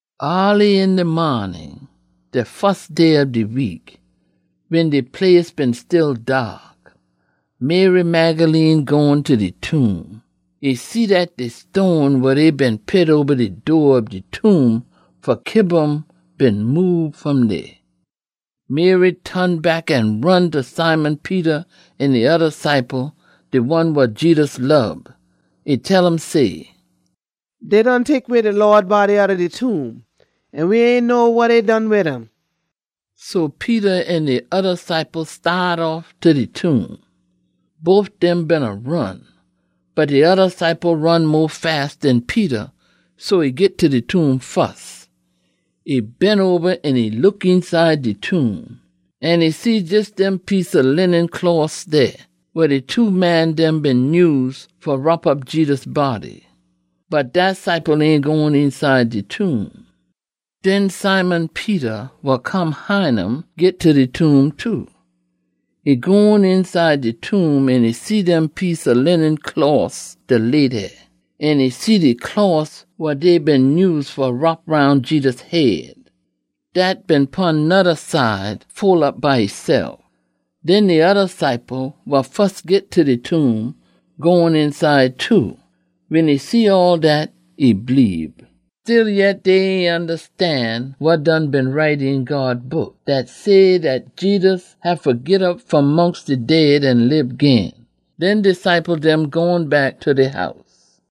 Aaly een de maanin, de fus day ob de week, wen de place been still daak, Mary Magdalene gone ta de tomb. E see dat de stone wa dey been pit oba de door ob de tomb fa kiba um been moob fom dey. Mary ton back an ron ta Simon Peter an de oda ciple, de one wa Jedus lob. E tell um say, “Dey done tek way de Lawd body outta de tomb an we ain know wa dey done wid um!” So Peter an de oda ciple staat off ta de tomb. Bof dem beena ron, bot de oda ciple ron mo fast den Peter, so e git ta de tomb fus. E bend oba an e look eenside de tomb. An e see jes dem piece ob linen closs dey, wa de two man dem been nyuse fa wrop op Jedus body. Bot dat ciple ain gone eenside de tomb. Den Simon Peter, wa come hine um, git ta de tomb too. E gone eenside de tomb an e see dem piece ob linen closs da lay dey. An e see de closs wa dey been nyuse fa wrop roun Jedus head. Dat been pon noda side, fole op by esef. Den de oda ciple, wa fus git ta de tomb, gone eenside too. Wen e see all dat, e bleebe. Stillyet dey ain ondastan wa done been write een God Book, dat say dat Jedus haffa git op fom mongst de dead an lib gin. Den de ciple dem gone back ta dey house.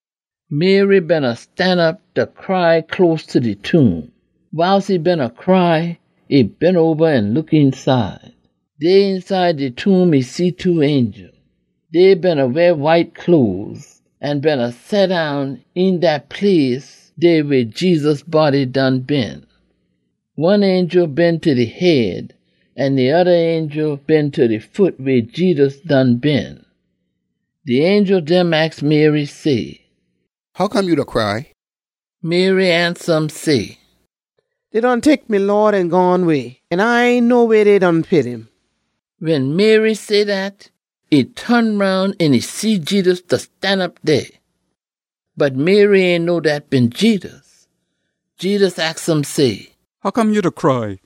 Mary beena stanop da cry close ta de tomb. Wiles e beena cry, e bend oba an look eenside. Dey eenside de tomb e see two angel. Dey beena weah white cloes an beena seddown een dat place dey weh Jedus body done been. One angel been ta de head, an de oda angel been ta de foot weh Jedus done been. De angel dem aks Mary say, “Hoccome ya da cry?” Mary ansa um say, “Dey done tek me Lawd an gone way, an A ain know weh dey pit um.” Wen Mary say dat, e ton roun an e see Jedus da stanop dey. Bot Mary ain know dat been Jedus. Jedus aks um say, “Hoccome ya da cry?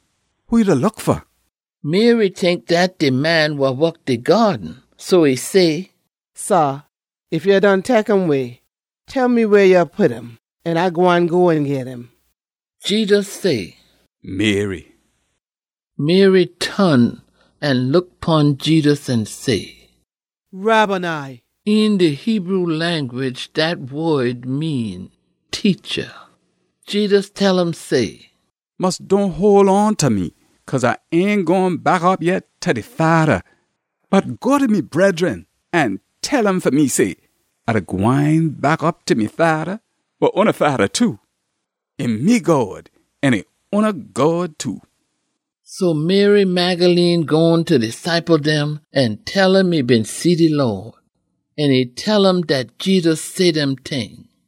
Who ya da look fa?” Mary tink dat de man wa wok de gyaaden, so e say, “Sah, ef ya done tek um way, tell me weh ya pit um an A gwine go an git um.” Jedus say, “Mary!” Mary ton an look pon Jedus an say, “Rabboni!” (Een de Hebrew language dat wod mean “Teacha.”) Jedus tell um say, “Mus dohn hole on ta me, cause A ain gone back op yet ta de Fada. Bot go ta me bredren an tell um fa me say, ‘A da gwine back op ta me Fada, wa oona Fada too. E me God an e oona God too.’” So Mary Magdalene gone ta de ciple dem an tell um e been see de Lawd. An e tell um dat Jedus say dem ting.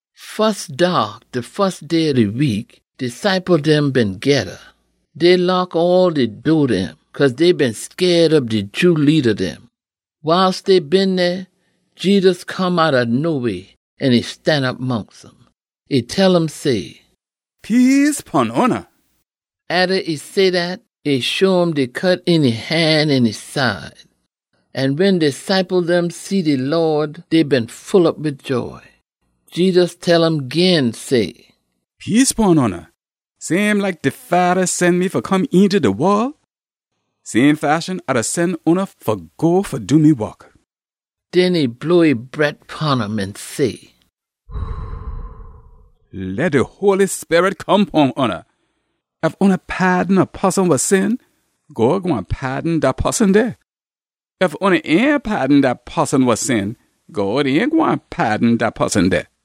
Fus daak de fus day ob de week, de ciple dem been geda. Dey lock all de door dem, cause dey been scaid ob de Jew leada dem. Wiles dey been dey, Jedus come outta noweh an e stanop mongst um. E tell um say, “Peace pon oona.” Atta e say dat, e show um de cut een e han an e side. An wen de ciple dem see de Lawd, dey been full op wid joy. Jedus tell um gin say, “Peace pon oona. Same like de Fada sen me fa come eenta de wol, same fashion A da sen oona fa go fa do me wok.” Den e blow e bret pon um an say, “Leh de Holy Sperit come pon oona. Ef oona paadon a poson wa sin, God gwine paadon dat poson dey. Ef oona ain paadon dat poson wa sin, God ain gwine paadon dat poson dey.”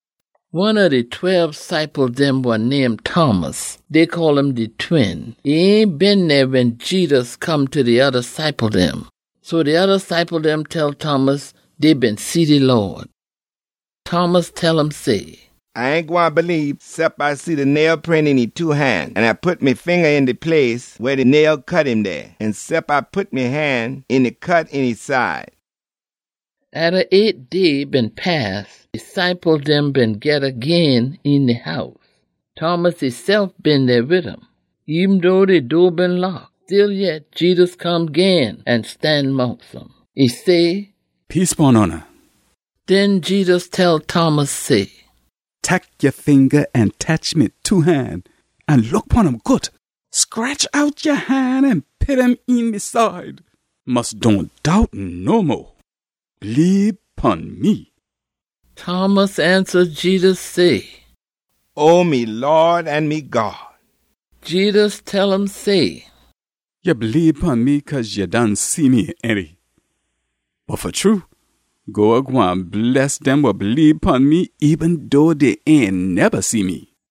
One ob de tweb ciple dem wa name Thomas (dey call um de Twin), e ain been dey wen Jedus come ta de oda ciple dem. So de oda ciple dem tell Thomas dey been see de Lawd. Thomas tell um say, “A ain gwine bleebe cep A see de nail print een e two han, an A pit me finga een de place weh de nail cut um dey, an cep A pit me han een de cut een e side.” Atta eight day been pass, de ciple dem been geda gin een de house. Thomas esef been dey wid um. Eben dough de door been lock, stillyet Jedus come gin an stan mongst um. E say, “Peace pon oona.” Den Jedus tell Thomas say, “Tek ya finga an tetch me two han an look pon um good. Scretch out ya han an pit um een me side. Mus dohn doubt no mo. Bleebe pon me!” Thomas ansa Jedus say, “O me Lawd an me God!” Jedus tell um say, “Ya bleebe pon me cause ya done see me, ainty? Bot fa true God gwine bless dem wa bleebe pon me eben dough dey ain neba see me.”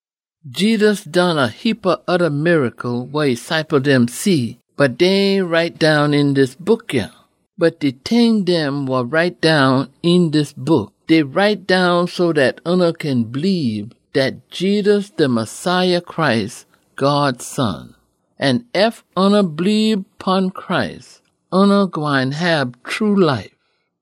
Jedus done a heapa oda miracle wa e ciple dem see, bot dey ain write down een dis book yah. Bot de ting dem wa write down een dis book, dey write down so dat oona kin bleebe dat Jedus de Messiah Christ, God Son. An ef oona bleebe pon Christ, oona gwine hab true life.